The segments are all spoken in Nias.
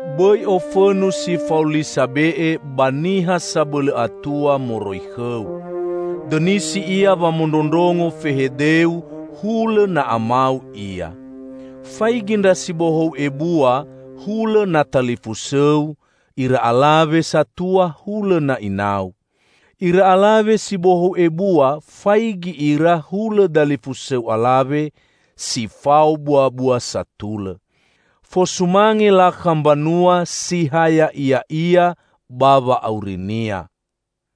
Bõi ofõnu si fao li sabe'e ba niha sabõlõ atua moroi khõu. Dõnisi ia wamondrondrongo fehedeu, hulõ na amau ia. Faigi ndra si bohou ebua hulõ na talifusõu, ira alawe satua hulõ na inau. Ira alawe si bohou ebua faigi ira hulõ dalifusõu alawe, si fao buabua satulõ. Fosumange lakha mbanua si ha ya'iya'ia ba wa'aurinia.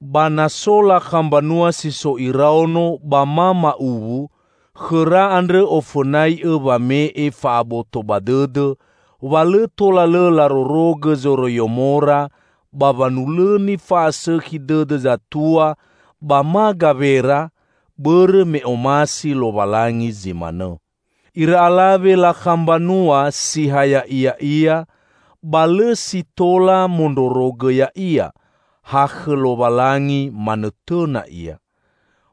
Ba na so lakha mbanua si so iraono ba ma ma'uwu, khõra andrõ ofõnai'õ wame'e fa'aboto ba dõdõ, wa lõ tola lõ larorogõ zoroiyomora, ba wanulõni fa'asõkhi dõdõ zatua ba ma gawera, bõrõ me omasi Lowalangi zi manõ. Ira alawe lakha mbanua si ha ya'iya'ia, ba lõ si tola mondrorogõ ya'ia, ha khõ Lowalangi manõtõna ia.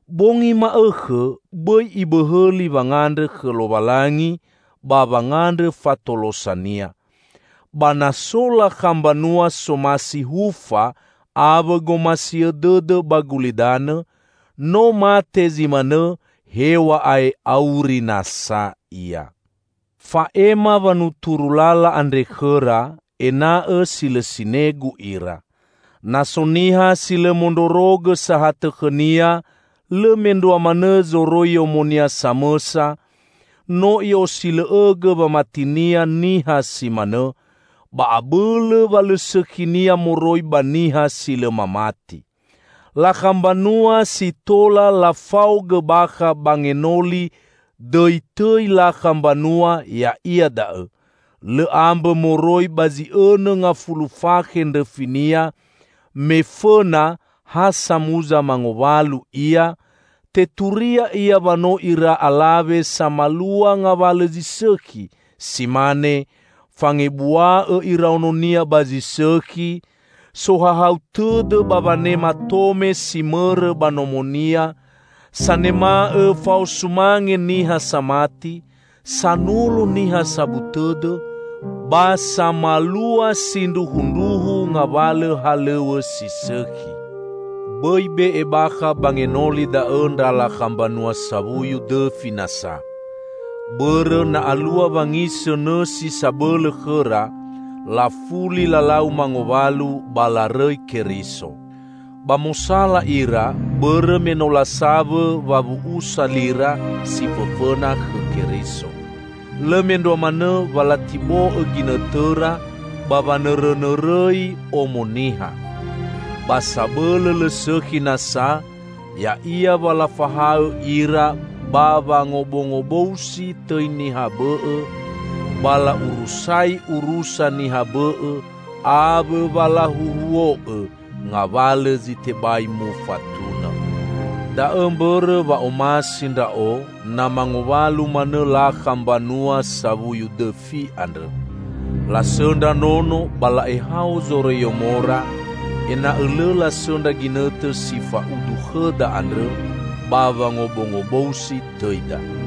Bongi ma'õkhõ bõi ibõhõli wangandrõ khõ Lowalangi ba wangandrõ fatolosa-Nia. Ba na so lakha mbanua somasi hufa awõ gomasiõ dõdõ ba gulidanõ, no mate zi manõ hew̃a'ae auri nasa ia. Fa'ema wanuturu lala andre khõra, ena'õ si lõ sinegu ira. Na so niha si lõ mondrorogõ sahatõ khõnia, lõ mendrua manõ zoroiyomonia samõsa, no i'osilõ'õgõ wamatinia niha si manõ; ba abõlõ wa lõ sõkhinia moroi ba niha si lõ mamati. Lakha mbanua si tola lafaogõ bakha ba ngenoli dõitõi lakha mbanua ya'ia da'õ: lõ ambõ moroi ba zi õnõ ngafulu fakhe ndrõfinia, me fõna ha samuza mangowalu ia, teturia ia wa no ira alawe samalua ngawalõ zi sõkhi, si mane: fangebua'õ iraononia ba zi sõkhi, sohahau tõdõ ba wanema tome si mõrõ ba nomonia, sanema'õ fao sumange niha samati, sanolo niha sabu tõdõ, ba samalua sindruhundruhu ngawalõ halõw̃õ si sõkhi. Bõi be'e bakha ba ngenoli da'õ ndra lakha mbanua sawuyu dõfi nasa. Bõrõ na alua wangisõ nõsi sabõlõ khõra, lafuli lalau mangowalu ba larõi Keriso. Ba mosala ira bõrõ me no lasawõ wawu'usa lira si fõfõna khõ Keriso. Lõ mendrua manõ wa latibo'õ ginõtõra ba wanõrõnõrõi omo niha. Ba sabõlõ lõ sõkhi nasa, ya'ia wa lafahaõ ira ba wangobongobousi tõi niha bõ'õ, ba la'urusai urusa niha bõ'õ awõ wa lahuhuo'õ ngawalõ zi tebai mufatunõ. Da'õ mbõrõ wa omasi ndra'o na mangowalu manõ lakha mbanua sawuyu dõfi andrõ, lasõndra nono ba la'ehao zoroiyomora, ena'õ lõ lasõndra ginõtõ si fa'udu khõda andrõ ba wangobongobousi tõida.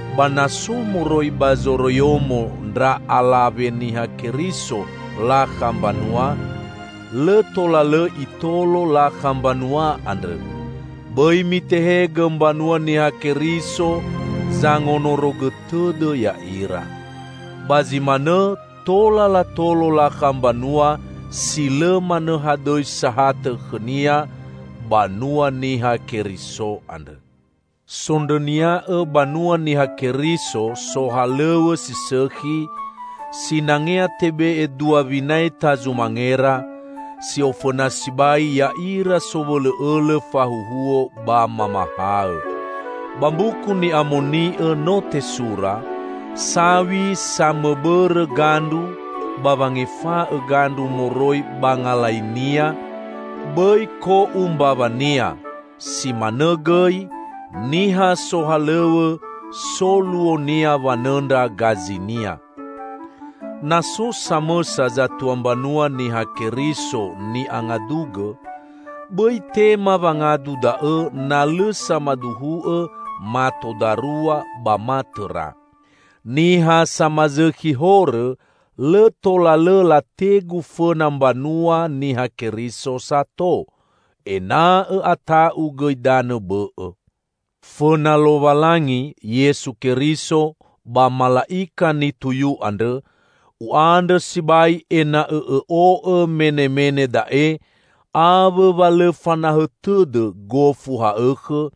Ba na so moroi ba zoroiyomo ndra alawa Niha Keriso lakha mbanua, lõ tola lõ itolo lakha mbanua andrõ; bõi mitehegõ mbanua Niha Keriso zangonorogõ tõdõ ya'ira. Ba zi manõ tola latolo lakha mbanua si lõ manõ hadõi sahatõ khõnia banua Niha Keriso andrõ. Sondrõnia'õ banua Niha Keriso sohalõw̃õ si sõkhi, sinangea tebe'e dua winaeta zumangera, si ofõna sibai ya'ira sowõlõ'õlõ fahuhuo ba mamahaõ. Ba Mbuku Ni'amoni'õ no tesura, "Saw̃i samõbõrõ gandru ba wangefa'õ gandru moroi ba ngalainia, bõi ko'u mbawania", si manõ gõi, "Niha sohalõw̃õ so luonia wanõndra gajinia". Na so samõsa zatua mbanua Niha Keriso ni'angadugõ, bõi tema wangadu da'õ na lõ samaduhu'õ mato darua ba ma tõra. Niha samazõkhi horõ, lõ tola lõ lategu fõna mbanua Niha Keriso sato, ena'õ ata'u gõi danõ bõ'õ. Fõna Lowalangi, Yesu Keriso ba mala'ika nituyu andrõ, u'andrõ sibai ena'õ õ'o'õ menemene da'e awõ wa lõ fanahõ tõdõ gofu ha'õkhõ,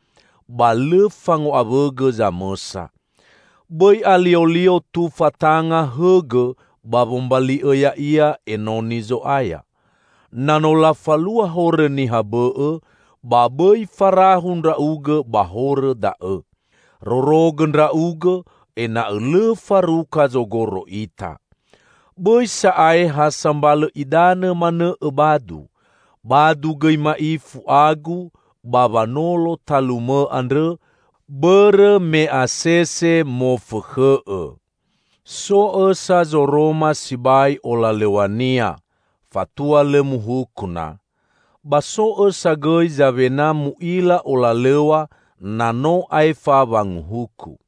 ba lõ fango'awõgõ zamõsa. Bõi aliolio tufa tanga hõgõ ba wombali'õ ya'ia enoni Zo'aya. Na no lafalua horõ niha bõ'õ, ba bõi farahu ndra'ugõ ba horõ da'õ. Rorogõ ndra'ugõ ena'õ lõ faruka zogoro ita. Bõi sa'ae ha sambalõ idanõ manõ õbadu; badu gõi ma'ifu agu ba wanolo talumõ andrõ, bõrõ me asese mofõkhõ'õ. So õsa zoroma sibai olalõw̃ania, fatua lõ muhuku na. Ba so õsa gõi zawena mu'ila olalõw̃a na no aefa wanguhuku.